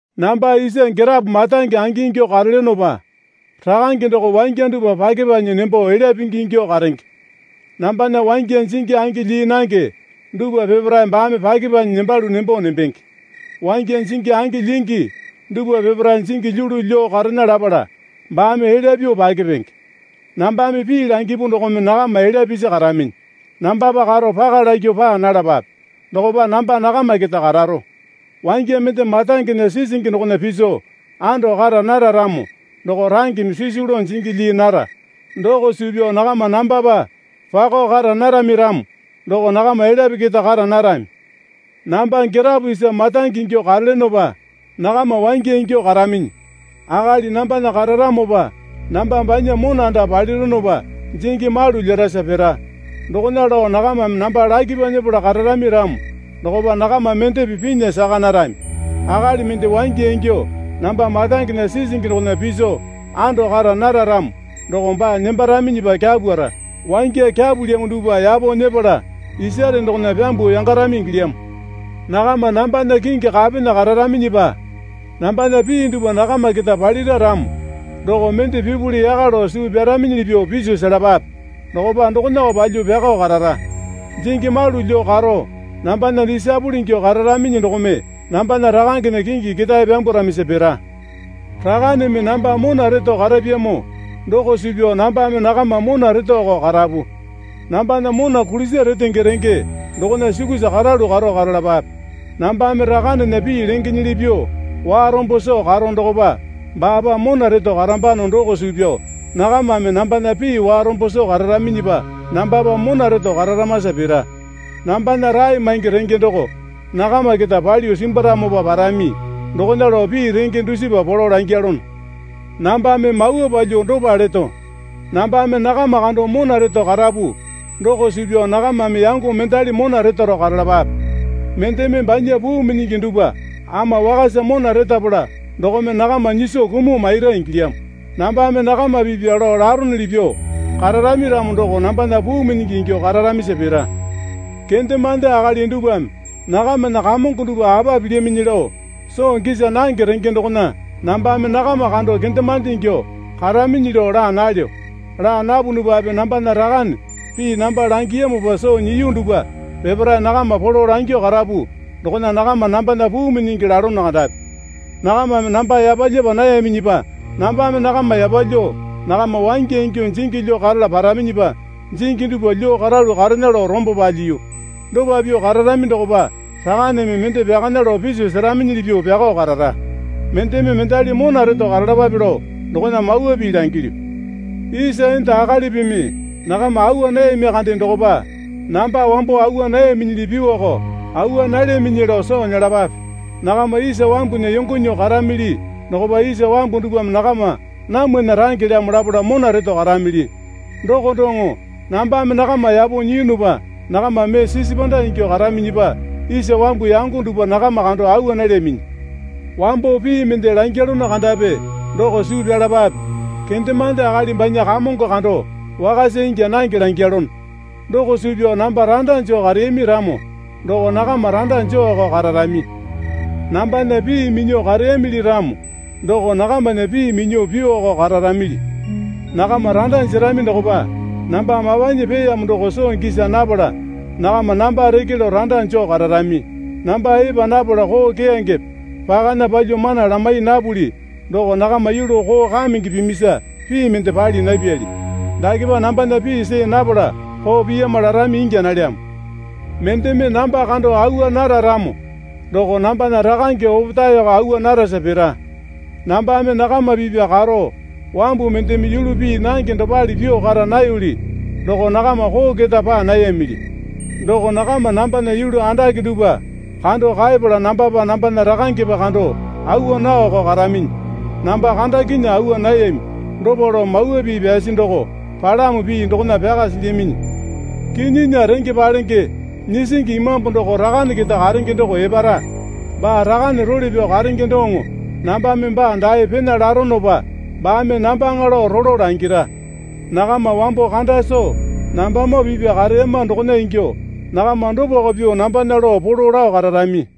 Namba isa girapo marange angingyuo karelyonopa Rakange doko wangya dupwa pyakepanyi nembo elya pingi ingyuo karenge. Nambana wangya jingi angi lyii nange dupwa peparae baame pyakepanyi nembalu nembo nembenge. Wangya jingi angi lyingi dupwa peparae jingi lyulu lyuo karena lapala baame elya pyuo pyakepenge. Nambame pii langipu dokome nakama elya pisi karaminyi. Nambapa karo paka lakyuo paa nalapape. Dokopa namba nakama keta kararo. Wangya mende marangena sisingi dokona piso ando kara nara ramo doko rangeme sisu lao jingi lyii nara doko suu pyao nakama nambapa pako kara narami ramo doko nakama elyape keta kara narami. Namba girapo isa marange ingyuo karelyonopa nakama wangya ingyuo karaminyi. Akali nambana kararamopa namba banya mona anda palironopa jingi malu lyerasa pira. Dokona lao nakamame namba lakipa nyepala kararami ramo dokopa nakama mendepe pinya saka narami. Akali mende wangya ingyuo namba marangena sisingi dokona piso ando kara nara ramo doko baa nembaraminyipa kyapwara. Wangya kyapulyamo dupwa yapo nyepala isare dokona pyambuo yangarami ingilyamo. Nakama nambana kingi kapena kararaminyipa nambana pii dupwa nakama keta palira ramo doko mende pipuli yaka lao suu pyaraminyili pyuo piso selapape. Dokopa dokonako palyuo pyakao karara. Jingi malu lyuo karo nambana disaepole ingyuo kararaminyi dokome nambana Rakangena kingi ketae pyambwaramisa pira. Rakaneme namba mona reto karapyamo doko suu pyao nambame nakama mona retoko karapu. Nambana mona kulisa retenge renge dokona sukusa karalu karo karalapape. Nambame Rakanena pii lengenyili pyuo warombo soo karo dokopa baapa mona reto karambano doko suu pyao nakamame nambana pii warombo soo kararaminyipa nambapa mona reto kararamasa pira. Nambana rae maingi renge doko nakama keta palyuo simbwaramopa parami dokona lao pii renge dusipa polo langyalono. Nambame mawa palyuo dopa leto. Nambame nakama kando mona reto karapu doko suu pyao nakamame yango mendali mona retaro karalapape. Mendeme banya puu minyingi dupwa ama wakasa mona retapala dokome nakama nyiso kumuo maira ingilyamo. Nambame nakama pipya lao laronuli pyuo kararami ramo doko nambana puu minyingi ingyuo kararamisa pira. Kendemande akali dupwame nakamana kamongo dupwa apa pilyaminyi lao soo gisa nange renge dokona nambame nakama kando kendemande ingyuo karaminyi lao laa nalyo. Laa napunupape nambana Rakane pii namba langiyamopa soo nyiya dupwa peparae nakama polo langyuo karapu dokona nakama nambana puu minyingi lalono kandapi. Nakamame namba yapalyapa nayaminyipa nambame nakama yapalyuo nakama wangya ingyuo jingi lyuo karala paraminyipa jingi dupwa lyuo karalu karena lao rombo palyiyu. Dopa pyuo kararami dokopa Rakaneme mende pyakana lao piso seraminyili pyuo pyakao karara. Mendeme mendali mona reto karalapape lao dokona mawa pii langilyu. Isa enda akalipimi nakama awa nayami kande dokopa, namba wambo awa nayaminyili pyuowako awa nalyaminyi lao soo nyelapape. Nakama isa wambunya yongo nyuo karamili dokopa isa wambu dupwame nakama namwana rangelyamo lapala mona reto karamili. Doko doŋo nambame nakama yapo nyiyunupa nakama mee sisi panda ingyuo karaminyipa isa wambu yango dupwa nakama kando awa nalyaminyi. Wambo pii mende langyalono kandapi doko suu pyalapape Kendemande akali banya kamongo kando wakasa ingya nange langyalono. Doko suu pyao namba randa joo kareyami ramo doko nakama randa jooko kararami. Nambana pii minyuo kareyamili ramo doko nakamana pii minyuo pyuoko kararamili. Nakama randa jerami dokopa namba mapanyi peeyamo doko soo gisa napala nakama namba reke lao randa joo kararami. Namba epa napala koo keyangepe pakana palyuo mana lamai napuli doko nakama yulu koo kamenge pimisa pii mende pali napyali. Dakepa nambana pii see napala koo piyama larami ingya nalyamo. Mendeme namba kando awa nara ramo doko nambana Rakange opetaeko awa narasa pira. Nambame nakama pipya karo wambu mendeme yulu pii nange dopale pyuo kara nayoli doko nakama koo keta paa nayamili. Doko nakama nambana yulu andake dupwa kando kaepala nambapa nambana Rakangepa kando awa naoko karaminyi. Namba kandakinyuo awa nayami, dopa lao Mawa Pii pyasi doko palamo pii dokona pyaka silyaminyi. Kinyinya Renge Palenge Nyisingi Imambu doko Rakane keta karenge doko epara. Baa Rakane role pyao karenge doŋo nambame baa dae pena laronopa baame nambaŋa lao rolo langira. Nakama wambo kanda soo nambamoo pipya kareyama dokona ingyuo nakama dopako pyuo nambana lao polo lao kararami.